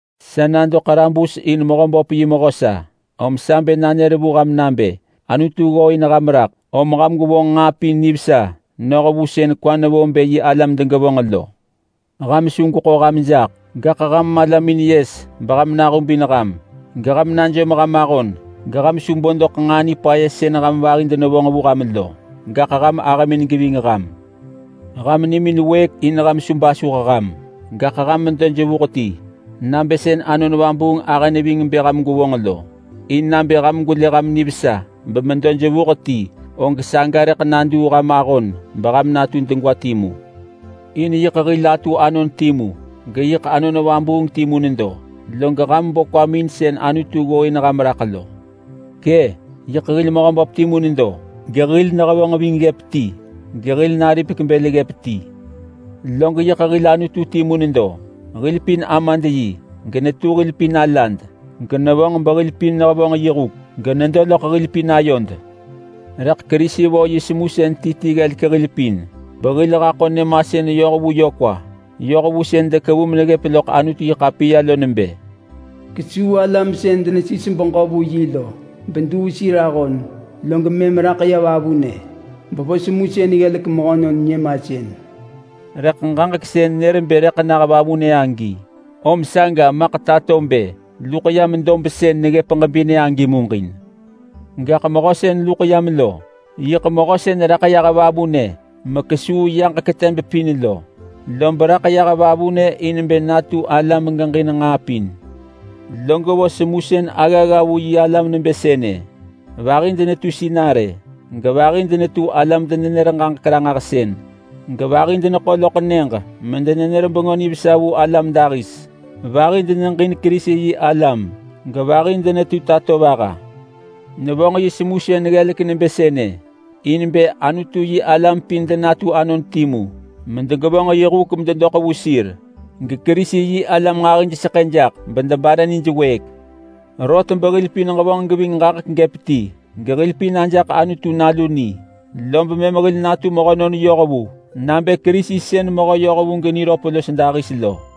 Sa nado ḳarabus in Mehöböp yi mehö sa. Om sa bë nanër vu ham nabë Anutu ggooin ham raḳ, om ham gwevonġ nġaa pin nivesa noh vu sën kwa nevo bë yi alam degevonġ lo. Ham su gweḳo ham jaḳ, gaḳ ham malamin yes beham nahubin ham, geham najom ham ahon geham su bo doḳ nġaa nipaya sën ham vahi denevonġ vu ham lo, gaḳ ham ahëmin geving ham. Ham nimin wëëk in ham su basuh ham, gaḳ ham medo jevuh ti nabë sën Anon Vabuung ahë neving bë ham gwevonġ lo. In nabë ham gwelë ham nivesa bemedo jevuh ti, og saga rëḳ naduu ham ahon beham natu degwa timu. In yiḳ hil atu anon timu, geyiḳ Anon Vabuung timu nedo, log ham bo kwamin in sën Anutu ggooin ham raḳ lo. Kë! Yiḳ hil Mehöböp timu nedo, gehil nehevonġ ving ggëp ti, gehil naripek bël ggëp ti. Log yiḳ hil Anutu timu nedo. Hil pin Amad yi, genetu hil pin alad, genevonġ behil pin nehevonġ yi huk, genedo loḳ hil pin ayod. Rëḳ Kerisi vo yi semusën ti ti ggelek hil pin, behil haḳo nyëmasën yoh vu yö kwa. Yoh vu sën dekevu meneggëp loḳ Anutu-yi-ḳapiya lo nebë: “Kesuu alam sën denesis beġö vu yi lo beduu sir ahon, log mëm raḳ yah vavunë bevo semusën ggelek mehönon nyëmasën.” Rëḳ ġaġek sën nër agi bë raḳ yah vavunë om saga maḳ tato bë luḳ yam dob sën neggëp ġebinë agi muġin. Gaḳ mehö sën luḳ yam lo, yiḳ mehö sën raḳ yah vavunë mekesuu yaġek teb pin lo, lob raḳ yah vavunë in bë natu ala megeġin nġaa pin. Log vo semusën aggagga vu yi alam nebë sënë: Vahi denetu sinarë, gevahi denetu alam-denenër-ġaġek-ranġahsën, gevahi deneḳo loḳ nyëġ medenenër Bengö Nivesa vu alam dahis. Vahi deneġin Kerisi-yi-alam gevahi denetu tatovaha. Nevonġ yi semusën ggelek nebë sënë in bë Anutu-yi-alam pin denatu anon timu medegevonġ yi huk mededoḳ vu sir, geKerisi-yi-alam nġahijseḳë jaḳ bedebare nijwëëk. Rot behil pin ġevonġ geving ġaġek gëp ti, gehil pin ajaḳ Anutu nalu ni, lob mëm hil natu mehönon yohvu nabë Kerisi sën mehö yohvu geniröp los dahis lo.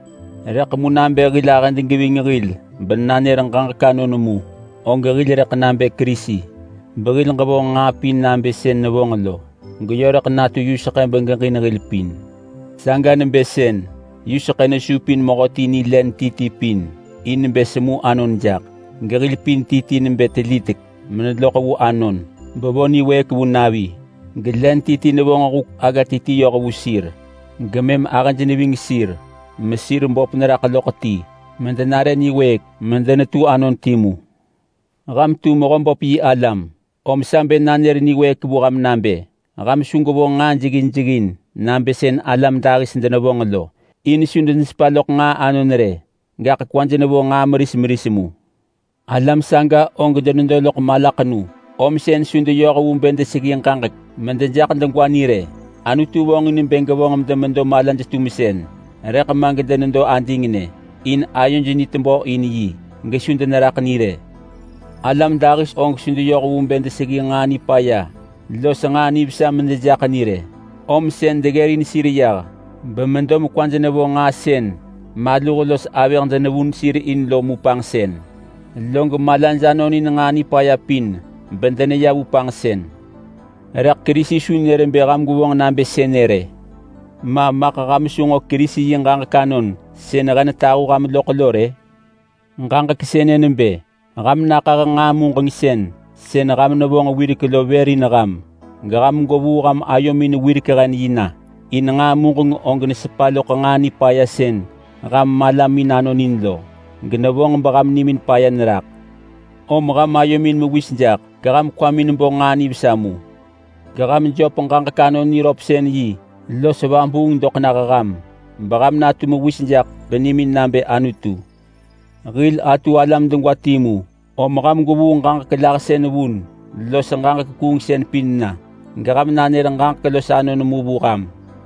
Rëḳ mu nabë hil ahëd geving hil benanër ġaġek anon mu, og hil rëḳ nabë Kerisi behil ġevonġ nġaa pin nabë sën nevonġ lo, geyö rëḳ natu yuseḳë begeġin hil pin. Saga nebë sën yuseḳë nesupin mehöti ni len ti ti pin in bë semu anon jaḳ. Gehil pin ti ti nebë telitek meneloḳ vu anon bevo niwëëk vu navi. Gelen ti ti nevonġ huk agga ti ti yoh vu sir. Gemëm ahëj neving sir mesir böp neraḳ loḳ ti medenare niwëëk medenetu anon timu. Ham tu Mehöböp yi alam om sa bë nanër niwëëk vu ham nabë ham su gwevonġ nġaa jeggin jeggin nabë sën alam dahis denevonġ lo. In su denesepa loḳ nġaa anon rë, gaḳ kwaj nevo nġaa meris meris mu. Alam saga og denedo loḳ malaḳenu, om sën su deyoh vu bë deseggi ġaġek medejaḳ degwa ni rë. Anutu vonġin bë gevonġ medemedo malaj-tumsën rëḳ ma gedenedo adingnë, in ayoj ni tebö in yi gesu deneraḳ ni rë. Alam dahis og su deyoh vu bë deseggi nġaa nipaya los nġaa nivesa medejaḳ ni rë, om sën deggërin sir yah bemedo mekwaj nevo nġaa sën maluh los avëh denevun sir in lo mu panġsën. Log malaj anonin nġaa nipaya pin bedeneya vu panġsën. Rëḳ Kerisi su nër bë ham gwevonġ nabë sënë rë. Ma maḳ ham su nġo Kerisi yi ġaġek anon sën he netahu ham loḳ lo rë? Ġaġek sënë nebë ham naḳah nġaa muġengsën sën ham nevonġ wirek lo vër in ham, geham gwevuu ham ayomin wirek-hen-yi na. In nġaa muġeng og nesepa loḳ nġaa nipaya sën ham malamin anonin lo, genevonġ beham nimin paya neraḳ. Om ham ayomin mewis jaḳ geham kwamin bo nġaa nivesa mu. Geham jöp ġaġek anon niröpsën-yi los vabuung doḳ nah ham, beham natu mewis jaḳ benimin nabë Anutu. Hil atu alam degwa timu om ham gwevuu ġaġek lahsën vun los ġaġek kuungsën pin na, geham nanër ġaġek los anon mu vu ham.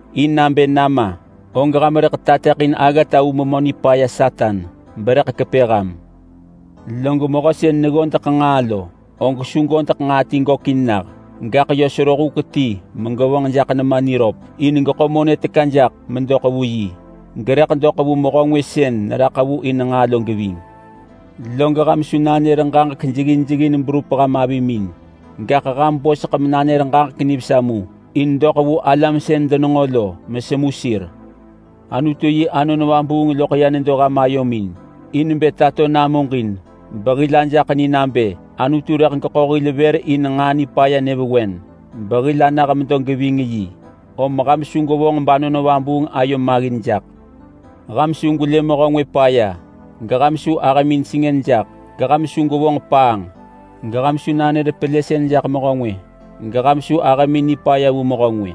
In nabë nama og ham rëḳ tateḳin aggata vu Memö Nipaya Satan berëḳ kepë ham. Log mehö sën neggodeḳ nġaa lo, og su godeḳ nġaa ti gökin nah. Gaḳ yö sero huk ti megevonġ jaḳ nema niröp in geḳo monë teka jaḳ medoḳ vu yi, gerëḳ doḳ vu mehö ngwë sën neraḳ vu in nġaa lo geving. Log ham su nanër ġaġek jeggin jeggin berup ham avimin. Gaḳ ham boseḳ menanër ġaġek nivesa mu in doḳ vu alam sën denenġo lo mesemu sir. Anutu yi Anon Vabuung loḳ ya nedo ham ayomin in bë tato namuġin behil ajaḳ ni nabë Anutu rëḳ geḳo hil vër in nġaa nipaya nyëvewen behil anah medo geving yi. Om ham su gwevonġ bAnon Vabuung ayo maggin jaḳ. Ham su gwelë mehö ngwë paya, geham su ahëmin sengën jaḳ, geham su gwevonġ paanġ, geham su nanër pelësën jaḳ mehö ngwë, geham su ahëmin nipaya vu mehö ngwë.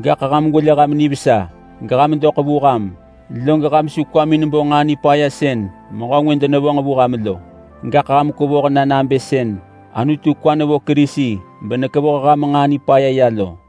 Gaḳ ham gwelë ham nivesa, geham doḳ vu ham. Log ham su kwamin bo nġaa nipaya sën mehö ngwë denevonġ vu ham lo. Gaḳ ham kwevoh na nabë sën Anutu kwa nevo Kerisi benekevoh ham nġaa nipaya ya lo.